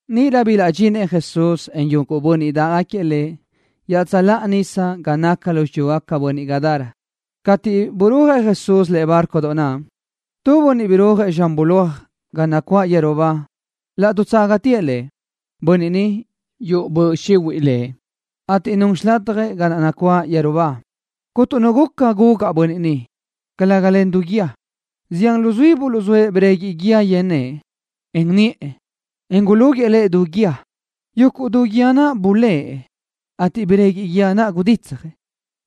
Níʼirö bilaʼdxinëʼ Jesús, en yuguʼ bönniʼ dáʼgaquiëʼ Lëʼ iaʼtsöláʼa nísadoʼ ga naca lu xiyúgaca bönachi Gadara. Cateʼ burúajëʼ Jesús lëʼe bárcodoʼ naʼ, tu bönniʼ rirúajëʼ zxan bulóaj ga nacuáʼ yeru ba laʼ dutságatëʼ Lëʼ. Bönniʼ ni yuʼu böʼ xihuiʼ lëʼ, ateʼ nun xilatjëʼ ga naʼ nacuáʼ yeru ba. Cuntu nu guca gugaʼ bönniʼ naʼ, calëga len du guíë. Zián luzuí buluʼzóëʼ breguiʼ guíë yen nëʼë, en niʼë, en gulúguiʼë lëʼ du guíë. Yuguʼ du guíë naʼ bulë́ʼë, ateʼ breguiʼ guíë naʼ guditsjëʼ.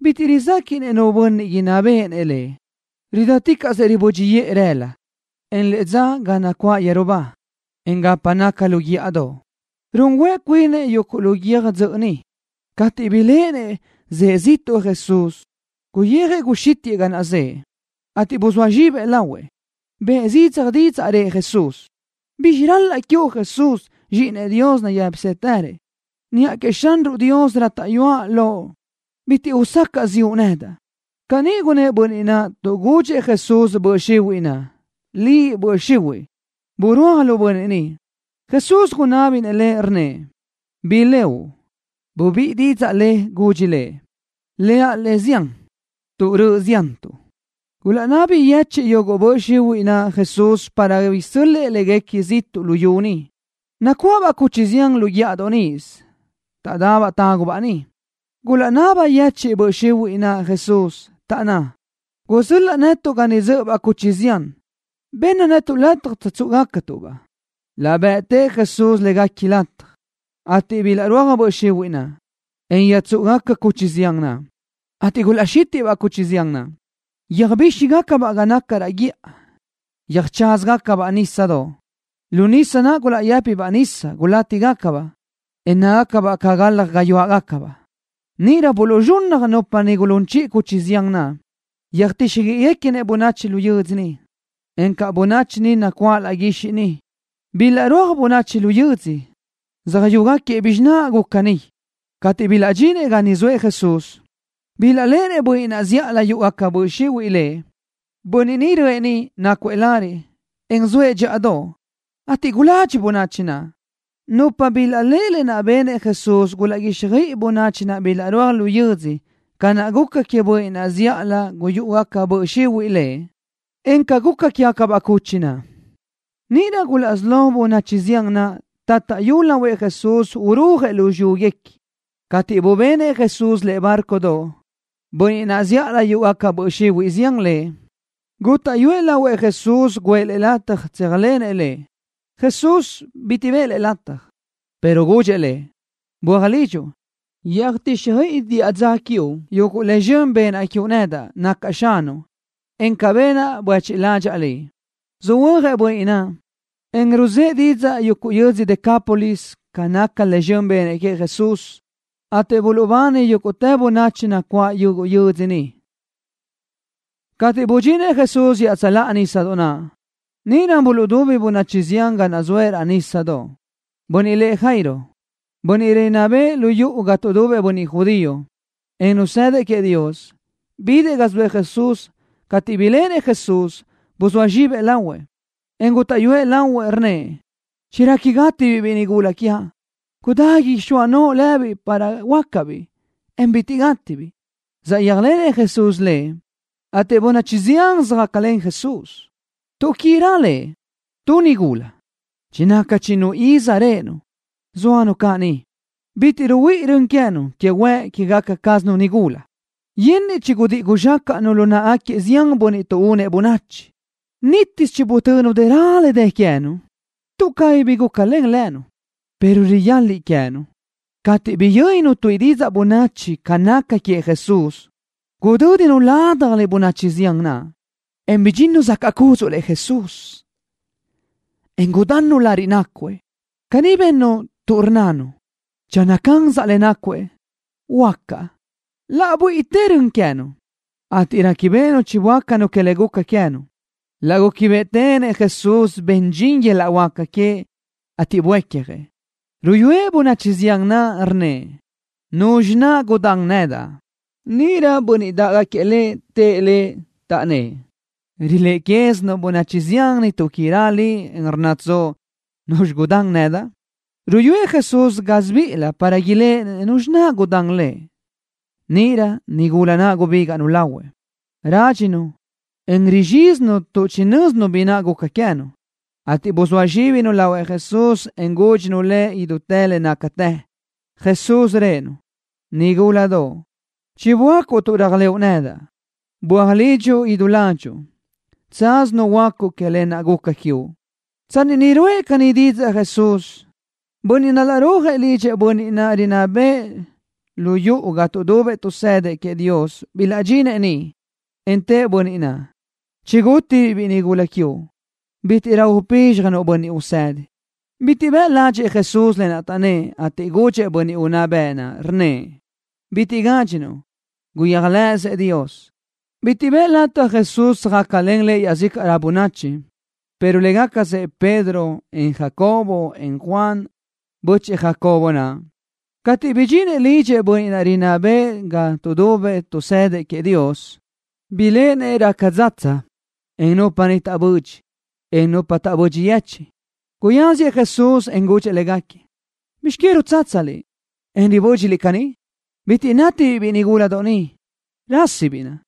Bitiʼ rizéquiʼnëʼ nu bönniʼ inná béʼenëʼ lëʼ. Ridáticaʼsëʼ ribö́dxiʼë rëla, en të dza ga naʼ nacuáʼ yeru ba, en gapa naca lu guíʼadoʼ, run huëʼ cuinëʼ yuguʼ lu guiö́j dzöʼö niʼ. Cateʼ biléʼenëʼ zëʼë ziʼtuʼ Jesús, guxítiʼë guyijëʼ ga naʼ zëʼë, ateʼ buzóa zxibëʼ lahuëʼ Lëʼ. Bëʼë zidzaj didzaʼ, rëʼ Jesús: —¿Bizxi ral-laʼa quiuʼ Jesús, Zxíʼinëʼ Dios nayë́pisëtërëʼ? Niʼa queëʼ Xanruʼ Dios rátaʼyuaʼ loʼ, bitiʼ usacaʼ ziʼu nedaʼ. Caní gunnë́ʼ bönniʼ naʼ tuʼ chigudxëʼ Jesús böʼ xihuiʼ naʼ: —Liʼ, böʼ xihuiʼ, burúaj lu bönniʼ ni. Jesús gunábinëʼ le, rnnëʼ: —¿Bi leuʼ? Bubíʼi didzaʼ le, gudxi Lëʼ: —Leaʼ: Le Zián, tuʼ röʼö ziantuʼ. Gulaʼnabi yechiʼ yuguʼ böʼ xihuiʼ naʼ Jesús para cabí isö́l-lëʼë léguequi ziʼtuʼ luyú niʼ. Nacuáʼabaʼ cuchi zián lu guíʼadoʼ níʼisö, taʼdabaʼ tágubaʼ niʼ. Gulaʼnabi yechiʼ böʼ xihuiʼ naʼ Jesús, taʼnná: —Gusöl-laʼ netuʼ ga niʼ dzö́ʼöbaʼ cuchi zián. Bëʼ netuʼ lataj tsöjtsúʼugacatuʼ-baʼ. Laʼ bëʼtëʼ Jesús léguequi lataj, ateʼ bilaʼrúaj böʼ xihuiʼ naʼ, en yöjtsúʼugaca cuchi zián naʼ, ateʼ gulaʼxítiʼbaʼ cuchi zián naʼ, yöjbíxigacabaʼ ga naca raʼ guíʼa, yöjcházagacabaʼ nísadoʼ. Lu nísadoʼ naʼ gulaʼyë́pibaʼ nisa, gulátibaʼ, en nácagacabaʼ ca galaj gayuáʼabaʼ. Níʼirö buluʼzxunnaj nupa niʼ gulún chiʼi cuchi zián naʼ. Yöjtíxjöiʼiguequinëʼ bönachi lu yödzö niʼ, encaʼ bönachi nacuáʼ laʼ guixiʼ niʼ. Bilaʼrúaj bönachi lu yödzö, söjyúgaquiëʼ bizxi naʼ guca niʼ. Cateʼ bilaʼdxinëʼ ga niʼ zoëʼ Jesús, bilaʼléʼenëʼ bönniʼ naʼ zíʼalö yúʼugaca böʼ xihuiʼ lëʼ. Bönniʼ ni röʼë niʼ, nácuëʼ lariʼ, en zoëʼ dxíʼadoʼ, ateʼ guladxi bönachi naʼ. Nupa naʼ bilaʼléʼe le benëʼ Jesús gulaʼguíxjöiʼi bönachi naʼ bilaʼrúaj lu yödzö ca naʼ guca queëʼ bönniʼ naʼ zíʼalö yúʼugaca böʼ xihuiʼ lëʼ, encaʼ ca guca quégacabaʼ cuchi naʼ. Níʼirö gulaʼsí lógaca bönachi zián naʼ taʼtaʼyu lahuëʼ Jesús urúajëʼ lu xiyúguequi. Cateʼ bubenëʼ Jesús lëʼe bárcodoʼ, bönniʼ naʼ zíʼalö yúʼugaca böʼ xihuiʼ zián lëʼ, gútaʼyuëʼ lahuëʼ Jesús guʼë lëʼ lataj tséajlenëʼ Lëʼ. Jesús bitiʼ bëʼë lëʼ lataj, pero gudxëʼ lëʼ: —Böaj lidxuʼ. Yöjtíxjöiʼi diʼa dza quiuʼ yuguʼ le zxön benaʼ quiuʼ nedaʼ, nacaʼ Xanuʼ, en ca benaʼ buéchiʼ ládxaʼa liʼ. Söhuö́jëʼ bönniʼ naʼ, en ruzë́ʼ didzaʼ yuguʼ yödzö Decápolis ca nácagaca le zxön benëʼ Jesús queëʼ, ateʼ buluʼbani yúguʼtë bönachi nacuáʼ yuguʼ yödzö niʼ. Cateʼ budxinëʼ Jesús iaʼtsöláʼa nísadoʼ naʼ, níʼirö buluʼdubi bönachi zián ga naʼ zoëʼ raʼ nísadoʼ. Bönniʼ lëʼ Jairo, bönniʼ rinná bëʼë lu yuʼu ga tuʼdubëʼ bönniʼ judío, en nazëdëʼ queëʼ Dios, bidëʼ ga zoëʼ Jesús. Cateʼ biléʼenëʼ Jesús, buzóa zxibëʼ lahuëʼ, en gútaʼyuëʼ lahuëʼ, rnnëʼ: —Chiraqui gátibiʼ biʼi nigúladoʼ quiaʼ. Gudá ixóa noʼo lëbiʼ para huöácabiʼ, en bitiʼ gátibiʼ. Saʼyéajlenëʼ Jesús lëʼ, ateʼ bönachi zián söjácalen Jesús, tuʼquirö Lëʼ. Tu nigula, chinaca chinnu iz réʼenu, zóanu caʼ niʼ. Bitiʼ ruhuíʼi rön queë́nu que huëʼ quégaca cázanu nigula. Yenniʼ chigudíʼi guzxácaʼnu lu náʼagaquiëʼ zián bönniʼ tuʼúnëʼ bönachi. Nítisö chibutönu dëra le dë queë́nu, tuʼ cabí bi gúcalen lënu, pero riyaliʼ queë́nu. Cateʼ biyö́ninu tuíʼi didzaʼ bönachi ca naca queëʼ Jesús, gudö́dinu ládjalö bönachi zián naʼ, en bidxinnu zacaʼ cúdzuʼlëʼ Jesús, en gudannu lariʼ nácuëʼ. Caní bennu tuʼ rnnanu: “Channö cansaʼ le nácuëʼ, huöácaʼ.” Laʼ buíʼitë rön queë́nu, ateʼ réquibeʼenu chiböácanu que le guca queë́nu. Laʼ gúquibeʼetenëʼ Jesús ben dxin yöl-laʼ huáca queëʼ, ateʼ buécjëʼ, ruyúëʼ bönachi zián naʼ. Rnnëʼ: —¿Nuzxi naʼ gudán nedaʼ? Níʼirö bönniʼ dáʼgaquiëʼ Lëʼ tëʼ Lëʼ, taʼnnë́ʼ: —Riléʼe quézinuʼ bönachi zián ni tuʼquirö Liʼ, en rnnatsoʼ: “¿Nuzxi naʼ gudán nedaʼ?” Ruyúëʼ Jesús gásibiʼilëʼ para iléʼenëʼ nuzxi naʼ gudán Lëʼ. Níʼirö nigula naʼ gubígaʼnu lahuëʼ. Rádxinu, en rizxízinu tuʼ chinö́zinu bi naʼ guca queë́nu, ateʼ buzóa zxíbinu lahuëʼ Jesús, en gúdxinu Lëʼ idútë le nácatë. Jesús rëʼë-nu: —Nigúladoʼ. Chiböácuʼ tuʼ réajlëʼu nedaʼ. Böaj lidxuʼ idú ládxuʼu. Tsaz nuhuöácuʼ que le guca quiuʼ. Tsanni niʼ ruʼë caní didzaʼ Jesús, bönniʼ narúajgaquiëʼ lidxëʼ bönniʼ naʼ rinná bëʼë lu yuʼu ga tuʼdubëʼ tuʼsëdëʼ queëʼ Dios bilaʼdxnëʼ niʼ, en tëʼ bönniʼ naʼ: —Chigútibiʼ biʼi nigúladoʼ quiuʼ. Bítiʼrö upízxjanuʼ Bönniʼ Usedi. Bitiʼ bëʼ ládxëʼë Jesús lë naʼ taʼnnë́ʼ, ateʼ gudxëʼ bönniʼ unná bëʼ naʼ, rnnëʼ: —Bitiʼ gádxinuʼ. Guyéajlëʼësëʼ Dios. Bitiʼ bëʼë lataj Jesús tsöjácalen Lëʼ iaʼzícaʼrö bönachi, pero légacasëʼ Pedro, en Jacobo, en Juan, bö́chëʼë Jacobo naʼ. Cateʼ bidxinëʼ lidxëʼ bönniʼ naʼ rinná bëʼë ga tuʼdubëʼ tuʼsëdëʼ queëʼ Dios, biléʼenëʼ raca dzatsa, encaʼ nupa niʼ taʼbödxi, en nupa taʼbödxi yechiʼ. Guyáziëʼ Jesús, en gudxëʼ légaquiëʼ: —¿Bizx que rutsátsaliʼ, en ribö́dxiliʼ caní? Bitiʼ nátibiʼ biʼi nigúladoʼ ni. Rásisibiʼ naʼ.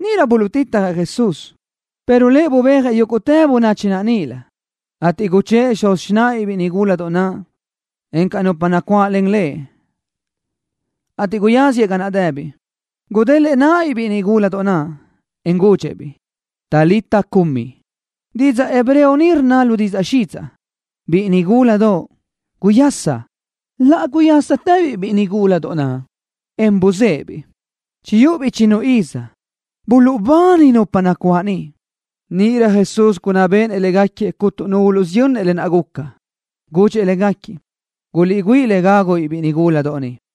Níʼirö buluʼtitjëʼ Jesús, pero Lëʼ bubéajëʼ yúguʼtë bönachi naʼ níʼilö, ateʼ guchë́ʼë xuz xináʼabiʼ biʼi nigúladoʼ naʼ, encaʼ nupa nacuáʼlen Lëʼ, ateʼ guyáziëʼ ga naʼ dëbiʼ. Gudélëʼë náʼabiʼ biʼi nigúladoʼ naʼ, en gudxëʼ-biʼ: —Talita, cumi. Didzaʼ hebreo ni rnna lu didzaʼ xidzaʼ: Biʼi nigúladoʼ, guyasa. Laʼ guyásatëbiʼ biʼi nigúladoʼ naʼ, en buzéʼebiʼ. Chiyúʼubiʼ chinnu iz. Buluʼbani nupa nacuáʼ niʼ. Níʼirö Jesús gunná béʼenëʼ légaquiëʼ cuntu nu uluʼsiyönnëʼ lë naʼ guca. Gudxëʼ légaquiëʼ: —Guliʼgüíʼ le gágubiʼ biʼi nigúladoʼ ni.